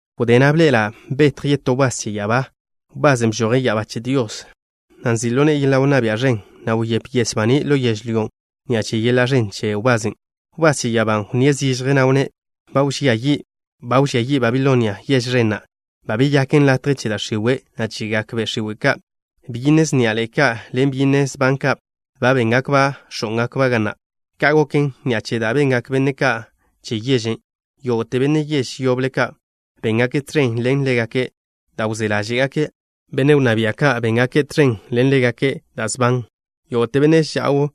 Wdé na' bḻe'ela' betj yetó wbás che ya'abá, wbasen' bžoje' ya'abá che Dios, na' nzi' ḻo ne'e yeḻa' wnná bia' ẕen, na' wyép yes baní' ḻo yežlyó ni'a che yeḻa' ẕen che wbasen'. Wbás che ya'abán' wnníe' zižje, na' wnné': Ba wžía yi'. Ba wžía yi' Babilonia, yež ẕen na'. Ba beyaken latje che da' x̱iwe', na' chegak be' x̱iwe' ka'. Byinne sníaḻe'e ka' ḻen byinne sban ka', ba béngakba' x̱ó'ngakba' ga na'. Ka' goken ni'a che da' bengak benne' ka' che yežen'. Yógo'te benne' yež yoble ka' béngake' tẕen ḻen ḻégake' da' wzé ḻáže'gake'. Benne' wnná bia' ka' béngake' tẕen ḻen ḻégake' da' sban. Yógo'te benne' ža'w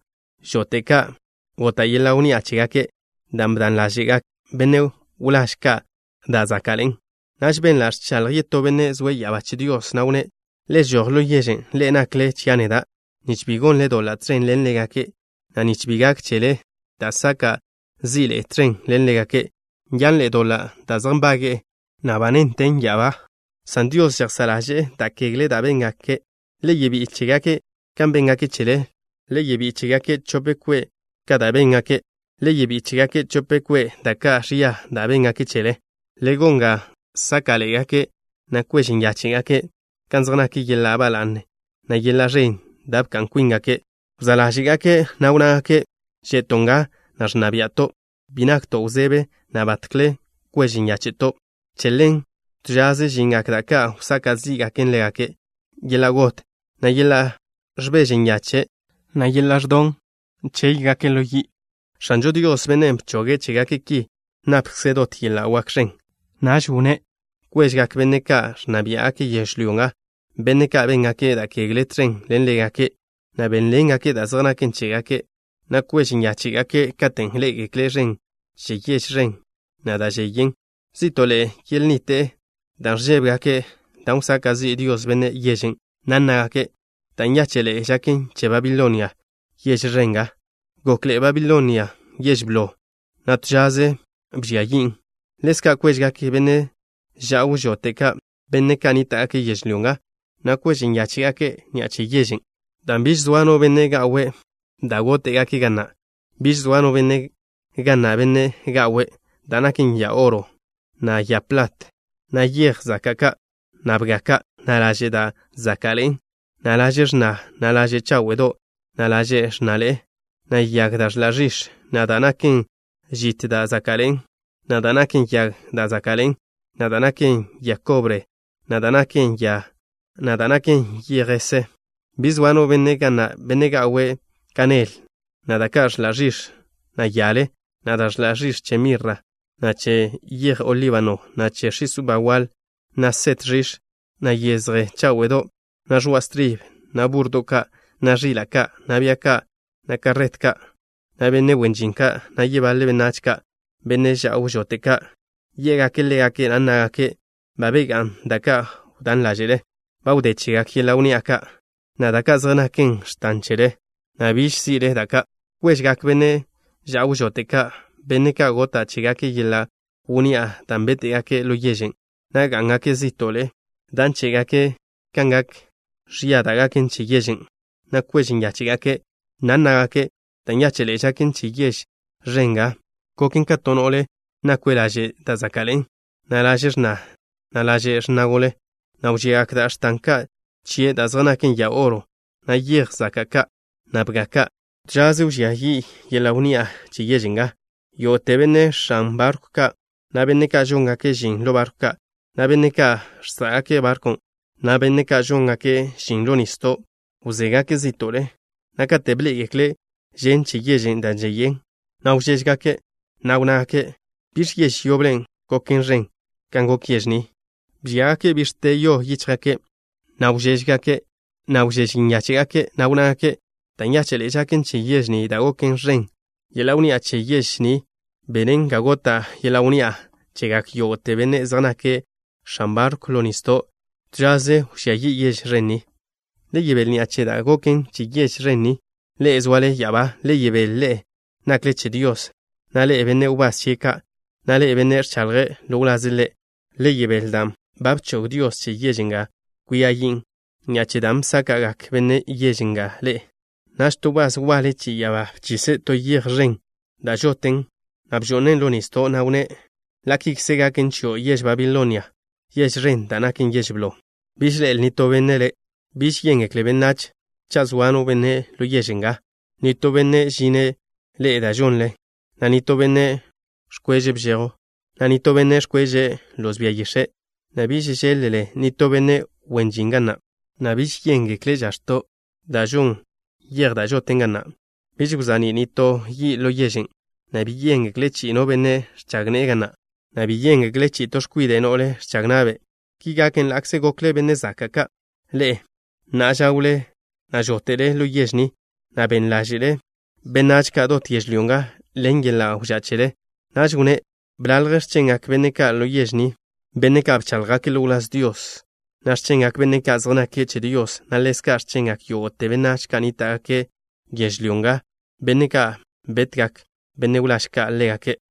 žote' ka' gota' yeḻa' wnni'a chégake', dan' bdan ḻáže'gak benne' wláž ka' da' záka'ḻe'en. Naž benla' ẕchaḻj yetó benne' zoe' ya'abá che Dios, na' wnné': Le žoj ḻo yežen', ḻe'e nakle chia' neda', nich bi gonle doḻa' tẕen ḻen ḻégake', na' nich bi gak chele da' saka' zi'le tẕen ḻen ḻégake'. Nyanḻe'e doḻa' da' zej nbage'e, na' ba néntelen ya'abá, san Dios žejsá' ḻaže'e da' kegle da' béngake'. Le yebí'i chégake' kan béngake' chele. Le yebí'i chégake' chope kwe' ka da' béngake'. Le yebí'i chégake' chope kwe' ka da' ẕia da' béngake' chele. Le gon ga sáka'ḻe'egake', na' kwež nyáche'gake' kan zej nak yeḻa' ba la'ne, na' yeḻa' ẕen da' bka'n kwíngake'. Wzá' ḻáže'gake', na' wnnágake': “Že'to' nga, na' ẕnna bia'to'. Bi nakto' wzebe, na' batkle kwež nyáche'to'.” Che ḻen, to žaze žingak da' ka' wsaka' zí'gaken ḻégake', yeḻa' got, na' yeḻa' ẕbeže nyache', na' yeḻa' ẕdon. Chéygake' ḻo yi'. X̱anžo Dios, Bennen' bchoge' chégake' ki, napkze' dot yeḻa' wak ẕen. Naž wnné': “Kwežgak benne' ka' ẕnna biá'gake' yežlyó nga, benne' ka' béngake' da' kegle tẕen ḻen ḻégake', na' bebéḻengekle' da' zej naken chégake', na' kwež nyáche'gake' katen' ḻé'egekle' žen che yež ẕen na' da' žeyen. Zí'to'le yelnnite'e dan' ẕžébegake' da' wsaka' zi' Dios benne' yežen', na' nnágake': Da' nyáche'ḻe'e žaken che Babilonia, yež ẕen nga. Gokḻe'e Babilonia yež blo, na' to žaze bžia yin'. ’Ḻezka' kwežgak benne' ža'w žote' ka', benne' ka' nníta'gake' yežlyó nga, na' kwež nyáche'gake' ni'a che yežen', dan' biž soa no benne' ga'we' da' góte'gake' ga na'. Biž soa no benne' ga na', benne' ga'we' da' naken ya oro, na' ya plat, na' yej zaka' ka', na' bga ka', na' laže' da' záka'ḻe'en, na' laže' x̱na, na' laže' cháwe'do', na' laže' x̱naḻe'e, na' yag da' ẕḻa' ẕix̱, na' da' naken žit da' záka'ḻe'en, na' da' naken yag da' záka'ḻe'en, na' da' naken ya kobre, na' da' naken ya, na' da' naken yej jese. ’Biž soa no benne' ga na', benne' ga'we' kanel, na' da' ka' ẕḻa' ẕix̱, na' yale, na' da' ẕḻa' ẕix̱ che mirra, na' che yeje olíbano, na' x̱is uba waḻ, na' set ẕix̱, na' yezje cháwe'do', na' ẕoa' stribe, na' búrrodo' ka', na' ẕila' ka', na' bia ka', na' karret ka', na' benne' wen žin ka', na' yebaḻe benách ka'. ’Benne' ža'w žote' ka' yé'gake' ḻégake', na' nnágake': Ba begá'a da' ka' wdán ḻáže'le. Ba wdé chegak yeḻa' wnni'a ka', na' da' ka' zej naken x̱tan chele, na' biž si'le da' ka'. ’Kwežgak benne' ža'w žote' ka', benne' ka' gota' chégake' yeḻa' wnni'a dan' béte'gake' ḻo yežen', na' gá'ngake' zí'to'le dan' chébegake' kan gak ẕia da' gaken che yežen', na' kwež nyáche'gake', na' nnágake': Da' nyáche'ḻe'e žaken che yež ẕen nga. Goken ka to no'le nakwe' laže' da' záka'ḻe'en, na' laže' x̱na, na' laže' x̱na gole, na' wžiagak da' x̱tan ka' chie' da' zej naken ya oro, na' yej zaka' ka', na' bga ka'. To žaze wžía yi' yeḻa' wnni'a che yež nga. ’Yógo'te benne' x̱an barkw ka', na' benne' ka' žóngake' žin ḻo barkw ka', na' benne' ka' žsá'gake' barkw ka', na' benne' ka' žóngake' žin ḻo nisdo', wzégake' zí'to'le, na' kate' bḻé'egekle' žen che yežen' da' žeyen, na' wžéžegake', na' wnnágake': ¿Biẕ yež yoble goken ẕen kan gok yež ni? ’Bžíagake' bix̱te yo yíchjgake', na' wžéžegake', na' wžéž nyáche'gake', na' wnnágake': Da' nyáche'ḻe'e žaken che yež ni da' goken ẕen. Yeḻa' wnni'a che yež ni benen ga gota' yeḻa' wnni'a chegak yógo'te benne' zej nake' x̱an barkw ḻo nisdo'. To žaze wžía yi' yež ẕen ni. Le yebél ni'a che da' goken che yež ẕen ni, ḻe'e zoale ya'abá. Le yebél, ḻe'e nakle che Dios, na' ḻe'e, benne' wbás chie' ka', na' ḻe'e, benne' ẕchaḻjle ḻo wlaze' Ḻe'. Le yebél dan' ba bchog Dios che yež nga kwia yin' ni'a che da' bsáka'gak benne' yež nga ḻe'e.” Naž to wbás waḻe che ya'abá bchise' to yej ẕen da' žoten, na' bžo'nen' ḻo nisdo', na' wnné': Ḻa' kikze gaken chio', yež Babilonia, yež ẕen da' naken yež blo. Biž ḻe'el nitó benne' le'. Biž yéngekle benách cha' zoa no benne' ḻo yež nga, nitó benne' žinne' ḻe'e da' žoḻen, na' nitó benne' ẕkweže' bžejw, na' nitó benne' ẕkweže' loz bia yix̱e', na' biž žeḻ-le nitó benne' wen žin ga na', na' biž yéngekle' žax̱to' da' žon yej da' žoten ga na'. Biž wza'ní' nitó yi' ḻo yežen', na' bi yéngekle' chi'i no benne' ẕchag ne'e ga na', na' bi yéngekle' chi'i to x̱kwide' no'le ẕchag na'be'. Ki gaken ḻa'kze gokle benne' zaka' ka', ḻe'e na' žá'wle, na' žóte'le ḻo yež ni, na' ben ḻáže'lele benách ka' dot yežlyó nga, ḻen yeḻa' wžá' chele. Naž wnné: “Bḻalj x̱chengak benne' ka' ḻo yež ni, benne' ka' bcháḻjgake' ḻo wláz Dios, na' x̱chengak benne' ka' zej nake' che Dios, na' ḻezka' x̱chengak yógo'te benách ka' wnníta'gake' yežlyó nga, benne' ka' betgak benne' wláž ka' ḻégake'.”